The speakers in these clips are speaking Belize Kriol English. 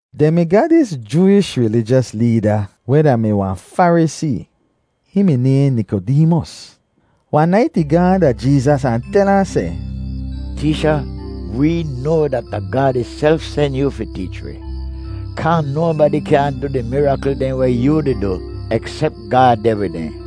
Dehn mi ga dis Jooish rilijos leeda weh da-mi wahn Farisee. Hihn mi nayhn Nikodeemos. Wahn nait ih gaahn da Jeezas ahn tel ahn seh, “Teecha, wee noa dat da Gaad ihself sen yoo fi teech wi kaa nobadi kyaahn du di mirakl dehn weh yoo di du, eksep Gaad deh wid dehn.”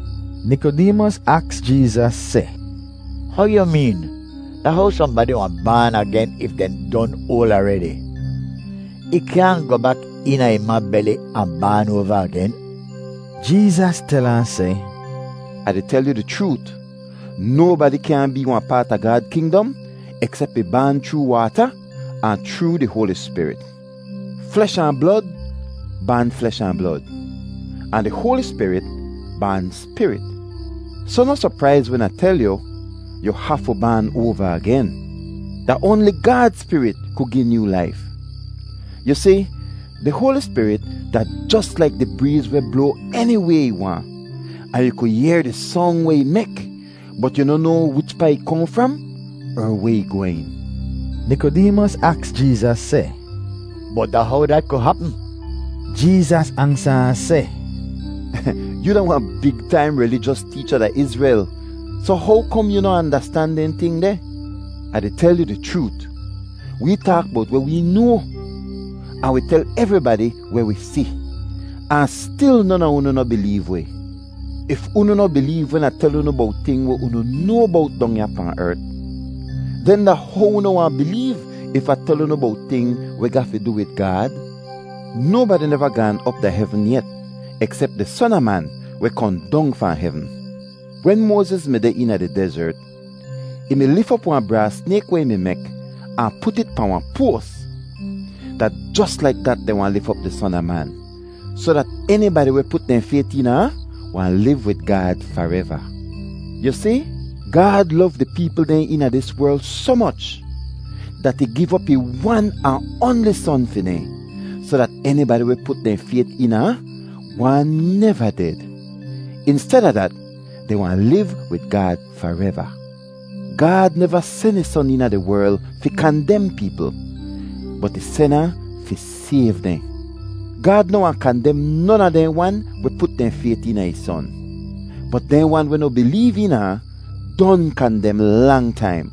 Nikodeemos aks Jeezas seh, “How yu meen? Da how sohnbadi wahn baan agen if dehn don oal aredi? Ih kyaahn goh bak eena ih ma beli ahn baan oava agen!” Jeezas tel ahn seh, “Ah di tel yu di chroot, nobadi kyaahn bee wahn paat a Gaad kingdom eksep ih baan chroo waata ahn chroo di Hoali Spirit. Flesh ahn blod baan flesh ahn blod, ahn di Hoali Spirit baan spirit. Soh noh sopraiz wen Ah tel yu, ‘Yu hafu baan oava agen.’ Da oanli Gaad Spirit ku gi nyoo laif. Yu si, di Hoali Spirit da jos laik di breez weh bloa eniway ih waahn, ahn yu ku yehr di song weh ih mek, bot yu noh noa wichpaa ih kohn fram er weh ih gwehn.” Nikodeemos aks Jeezas seh, “Bot da how dat ku hapm?” Jeezas ansa ahn seh, “Yoo da wahn big taim rilijos teecha da Izrel, soh how kom yoo noh andastan dehn ting deh? Ah di tel yu di chroot, wee taak bowt weh wee noa, ahn wi tel evribadi weh wi si, ahn stil non a unu noh bileev wi. If unu noh bileev wen Ah tel unu bowt ting weh unu noa bowt dong ya pahn ert, den da how unu wahn bileev if Ah tel unu bowt ting weh ga fi du wid Gaad? Nobadi neva gaan op da hevn yet eksep di Son a Man weh kohn dong fahn hevn. Wen Moaziz mi deh eena di dezert, ih mi lif op wahn braas snayk weh ih mi mek ahn put it pahn wahn poas. Da jos laik dat dehn wahn lif op di Son a Man, soh dat enibadi weh put dehn fayt eena ahn wahn liv wid Gaad fareva. “Yu si, Gaad lov di peepl dehn eena dis werl soh moch dat ih giv op ih wan ahn oanli Son fi dehn, soh dat enibadi weh put dehn fayt eena ahn wahn neva ded; insteda dat, dehn wahn liv wid Gaad fareva. Gaad neva sen ih Son eena di werl fi kandem peepl, bot ih sen ahn fi sayv dehn. Gaad noh wahn kandem non a dehn wan weh put dehn fayt eena ih Son, bot dehn wan weh noh bileev eena ahn don kandem lang taim,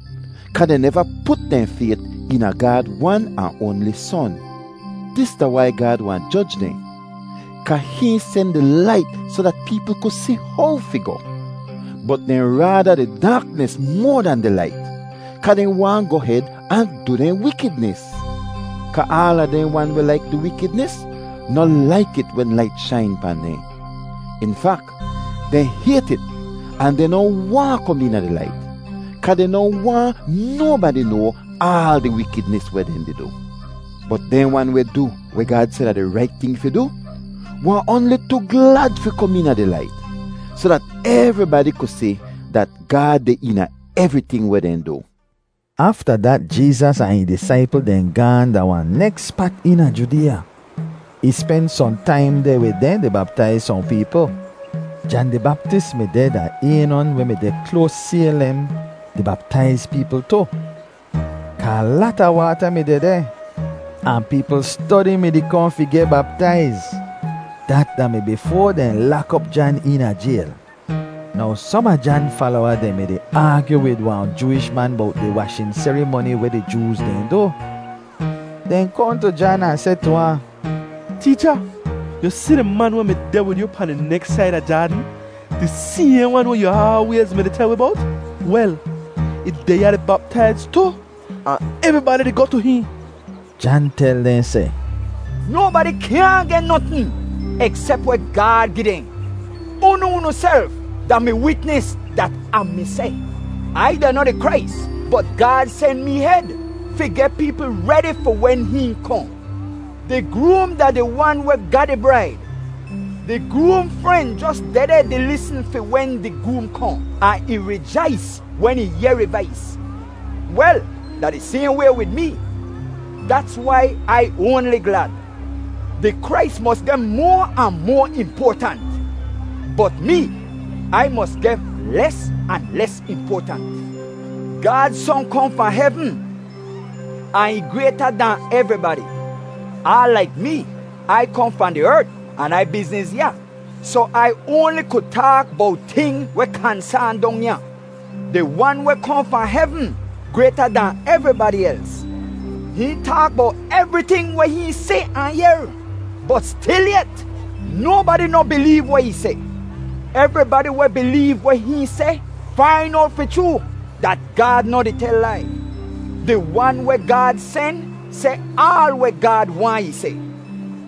kaa dehn neva put dehn fayt eena Gaad wan ahn oanli Son. “Dis da wai Gaad wahn joj dehn: kaa hihn sen di Lait soh dat peepl ku si how fi goh; bot dehn raada di daaknis moa dan di lait, kaa dehn waahn goh hed ahn du dehn wikidnis. Kaa aala dehn wan weh laik du wikidnis noh laik it wen lait shain pahn dehn. In fak, dehn hayt it ahn dehn noh waahn kom eena di lait, kaa dehn noh waahn nobadi noa aal di wikidnis weh dehn di du. Bot dehn wan weh du weh Gaad seh da di rait ting fi du, wahn oanli tu glad fi kom eena di lait, soh dat evribadi ku si dat Gaad deh eena evriting weh dehn du.” Afta dat Jeezas ahn ih disaipl dehn gaahn da wahn neks spat eena Judeeya. Ih spen sohn taim deh wid dehn di baptaiz sohn peepl. Jan di Baptis mi deh da Aynon weh mi deh kloas Saylem di baptaiz peepl tu, kaa lata waata mi dehdeh, ahn peepl stodi mi-di kohn fi geh baptaiz. Dat da-mi bifoa dehn lak op Jan eena jayl. Now som a Jan falowa dehn mi-di aagyu wid wahn Jooish man bowt di washin serimoni weh di Jooz dehn du. Dehn kohn tu Jan ahn seh tu ahn, “Teecha, yu si di man weh mi deh wid yu pahn di neks said a Jaadn, di sayhn wan weh yu aalwayz mi-di tel wi bowt? Wel, ih deh ya di baptaiz tu, ahn evribadi di goh tu hihn.” Jan tel dehn seh, “Nobadi kyaahn geh notn eksep weh Gaad gi dehn. Unu unuself da mi witnis dat Ah mi seh, ‘Ai da noh di Krais, bot Gaad sen mee hed fi geh peepl redi fi wen hihn kohn.’ Di groom da di wan weh ga di braid. Di groom fren jos dehdeh di lisn fi wen di groom kohn, ahn ih rijais wen ih yehr ih vais. Wel, da di sayhn way wid mee; dats wai Ai oanli glad. Di Krais mos geh moa ahn moa impoatant, bot mee, Ai mos geh les ahn les impoatant. “Gaad Son kohn fahn hevn ahn ih grayta dahn evribadi; aal laik mee, Ai kohn fahn di ert an Ai bizniz ya, soh Ai oanli ku taak bowt ting weh kansaan dong ya. Di wan weh kohn fahn hevn grayta dahn evribadi els. Hihn taak bowt evriting weh hihn si ahn yehr, bot stilyet, nobadi noh bileev weh ih seh. Evribadi weh bileev weh hihn seh fain owt fi chroo dat Gaad noh di tel lai. Di wan weh Gaad sen seh aal weh Gaad waahn ih seh,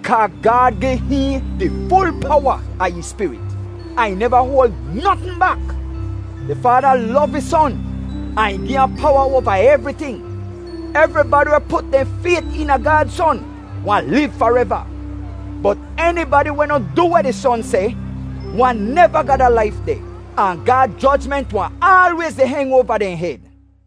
kaa Gaad gi hihn di ful powa a ih Spirit, ahn ih neva hoal notn bak. Di Faada lov ih Son, ahn ih gi ahn powa oava evriting. Evribadi weh put dehn fayt eena Gaad Son wahn liv fareva; bot enibadi weh noh du weh di Son seh wahn neva ga da laif deh, ahn Gaad jojment wahn aalwayz di heng oava dehn hed.”